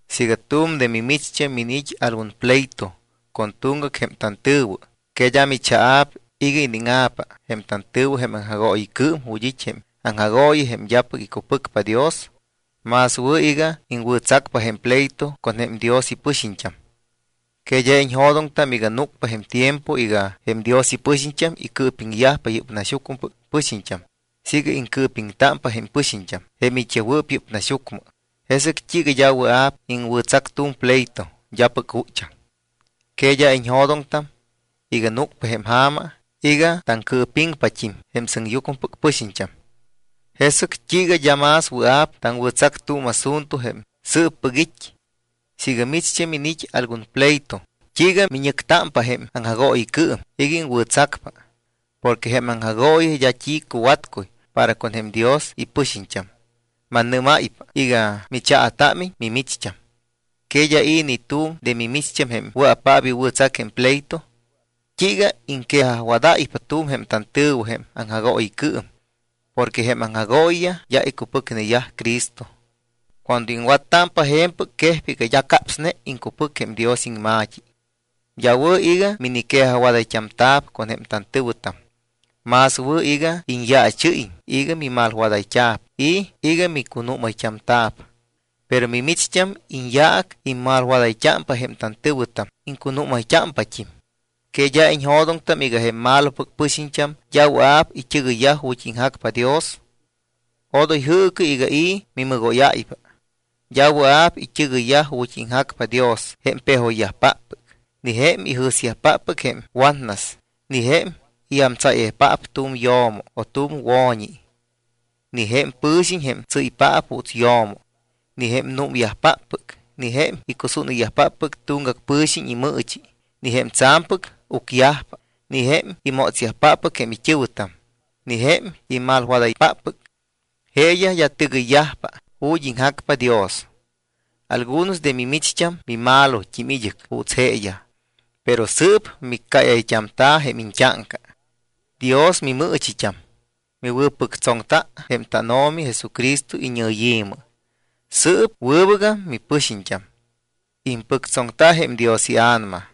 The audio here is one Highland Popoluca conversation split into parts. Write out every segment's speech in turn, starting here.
Siiga tu̱m de mimicht́am iniit́ algun pleito con tuŋgac jém tantɨ̱wɨ, ¿que d́a michaa̱p iga iníŋa̱pa jém tantɨ̱wɨ jém aŋjagooyicɨɨm ju̱t́ it́ jém aŋjagooyi jém d́apɨc icupɨcpa Dios? Más wɨ̱ iga iŋwɨ̱tsacpa jém pleito con jém Dios ipɨxiñt́am. ¿Que d́a iñjo̱doŋtam iga núcpa jém tiempo iga jém Dios ipɨxiñt́am icɨɨpiŋyajpa yɨ́p naxyucmɨpɨc pɨxiñt́am? Siiga iŋcɨɨpiŋtámpa jém pɨxiñt́am, jém it́yajwɨɨp yɨ́p naxyucmɨ, ¿jesɨc t́iiga d́a wɨa̱p iŋwɨ̱tsac tu̱m pleito d́apɨc juchaŋ? ¿Que d́a iñjo̱doŋtam iga núcpa jém ja̱ma iga taŋcɨɨpiŋpat́im jém sɨŋyucmɨpɨc pɨxiñt́am? Jesɨc t́iiga d́a más wɨa̱p taŋwɨ̱tsac tu̱m asunto jém sɨɨppɨc it́. Siiga micht́am iniit́ algun pleito, ¿t́iiga miñɨctámpa jém aŋjagooyicɨɨm iga iŋwɨ̱tsacpa? Porque jém aŋjagooyiyaj d́a t́i cuwatcuy para con jém Dios ipɨxiñt́am. Mannɨ́máypa iga michaatámiñ mimicht́am. ¿Que d́a i̱ ni tu̱m de mimicht́am jém wɨa̱paap iwɨ̱tsac jém pleito? ¿T́iiga iŋquejajwadáypa tu̱m jém tantɨ̱wɨ jém aŋjagooyicɨɨm? Porque jém aŋjagooyiyaj d́a icupɨcneyaj Cristo. Cuando iŋwattámpa je̱mpɨc, quejpa iga d́a capsne iŋcupɨc jém Dios iŋma̱t́i. D́a wɨ̱ iga miniquejajwadayt́amta̱p con jém tantɨ̱wɨtam. Más wɨ̱ iga iñyaachɨ́yiñ iga mimalwadayt́a̱p y iga micunúmayt́amta̱p. Pero mimicht́am iñyaac immalwadayt́ámpa jém tantɨ̱wɨtam, iŋcunúmayt́ámpat́im. ¿Que d́a iñjo̱doŋtam iga jém malopɨc pɨxiñt́am d́a wɨa̱p it́ɨgɨyyaj ju̱t́ iŋjacpa Dios? Odoy jɨɨcɨ iga i̱ mimɨgóyáypa. D́a wɨa̱p it́ɨgɨyyaj ju̱t́ iŋjacpa Dios jém pejoyyajpáppɨc, ni jém ijɨ̱syajpáppɨc jém watnas, ni jém iyamtsaaya̱paap tu̱m yo̱mo o tu̱m wo̱ñi, ni jém pɨ̱xiñ jém tsɨ́ypaap juuts yo̱mo, ni jém númyajpáppɨc ni jém icusúnɨypáppɨc tuŋgac pɨ̱xiñ imɨɨchi, ni jém tsa̱mpɨc ucyajpa, ni jém imotsyajpáppɨc jém it́ɨ̱wɨtam, ni jém imalwadaypáppɨc. Jeeyaj d́a tɨgɨyyajpa ju̱t́ iŋjacpa Dios. Algunos de mimicht́am mimalot́im id́ɨc juuts jeeyaj. Pero sɨɨp miccáyayt́amta̱ jém iñt́áŋca. Dios mimɨɨchit́am. Miwɨ̱pɨctsoŋta jém tánO̱mi Jesucristo iñɨyi̱mɨ, sɨɨp wɨbɨgam mipɨxiñt́am. Impɨctsoŋta jém Dios iA̱nama.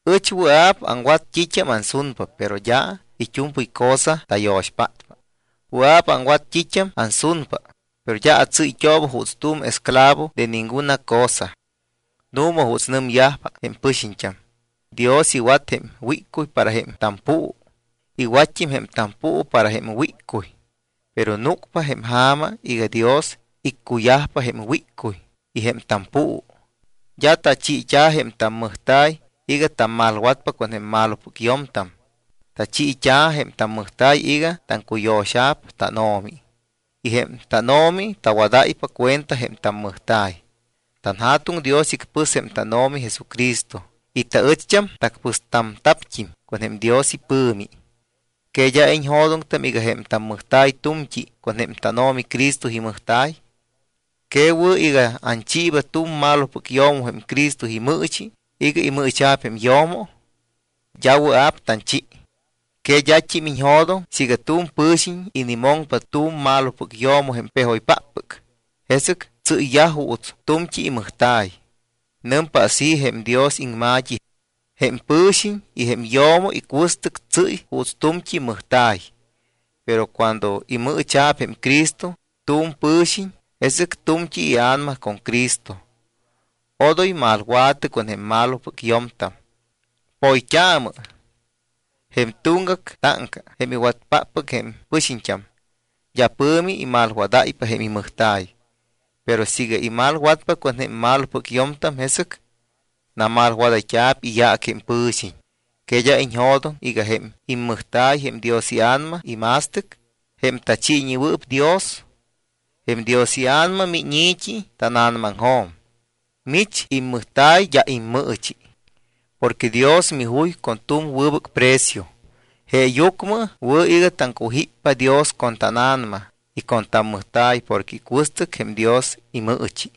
Ɨch wɨa̱p aŋwat t́it́am ansunpa, pero d́a it́u̱mpɨy cosa tayo̱xpátpa. Wɨa̱p aŋwat t́it́am ansunpa, pero d́a atsɨ́ytooba juuts tu̱m esclavo de ninguna cosa. Nu̱ma juuts nɨmyajpa jém pɨxiñt́am: “Dios iwat jém wíccuy para jém tampuu. Iwatt́im jém tampuu para jém wíccuy.” Pero núcpa jém ja̱ma iga Dios iccuyajpa jém wíccuy y jém tampuu. D́a tachiit́a̱ jém tammɨjta̱y iga tammalwatpa con jém malopɨc yo̱mtam. Tachiit́a̱ jém tammɨjta̱y iga taŋcuyo̱xa̱p tánO̱mi, y jém tánO̱mi tawadáypa cuenta jém tammɨjta̱y. TanJa̱tuŋ Dios icpɨs jém tánO̱mi Jesucristo y taɨcht́am tacpɨstamta̱pt́im con jém Dios ipɨ̱mi. ¿Que d́a iñjo̱doŋtam iga jém tammɨjta̱y tu̱mt́i con jém tánO̱mi Cristo imɨjta̱y? ¿Que wɨ̱ iga anchiiba tu̱m malopɨc yo̱mo jém Cristo imɨɨchi iga imɨɨcha̱p jém yo̱mo? ¡D́a wɨa̱p tanchi! ¿Que d́at́im iñjo̱doŋ siiga tu̱m pɨ̱xiñ inimoŋpa tu̱m malopɨc yo̱mo jém pejoypáppɨc, jesɨc tsɨ́yyaj juuts tu̱mt́i mɨjta̱y? Nɨmpa así jém Dios iŋma̱t́i: “Jém pɨ̱xiñ y jém yo̱mo icuɨstɨc tsɨ́y juuts tu̱mt́i mɨjta̱y.” Pero cuando imɨɨcha̱p jém Cristo tu̱m pɨ̱xiñ, jesɨc tu̱mt́i ia̱nama con Cristo. Odoy malwa̱tɨ con jém malopɨc yo̱mtam, poyt́aamɨ. Jém tuŋgac táŋca, jém iwatpáppɨc jém pɨxiñt́am, d́a pɨ̱mi imalwadáypa jém imɨjta̱y. Pero siiga imalwatpa con jém malopɨc yo̱mtam, jesɨc namalwadayt́a̱p iyaac jém pɨ̱xiñ. ¿Que d́a iñjo̱doŋ iga jém immɨjta̱y jém Dios iA̱nama ima̱stɨc, jém tachiiñewɨɨp Dios; jém Dios iA̱nama miñ i̱t́i tána̱namaŋjo̱m? Mich immɨjta̱y d́a immɨɨchi. Porque Dios mijuy con tu̱m wɨbɨc precio. Jeeyucmɨ wɨ̱ iga taŋcujíppa Dios con tána̱nama y con tammɨjta̱y porque icuɨstɨc jém Dios imɨɨchi.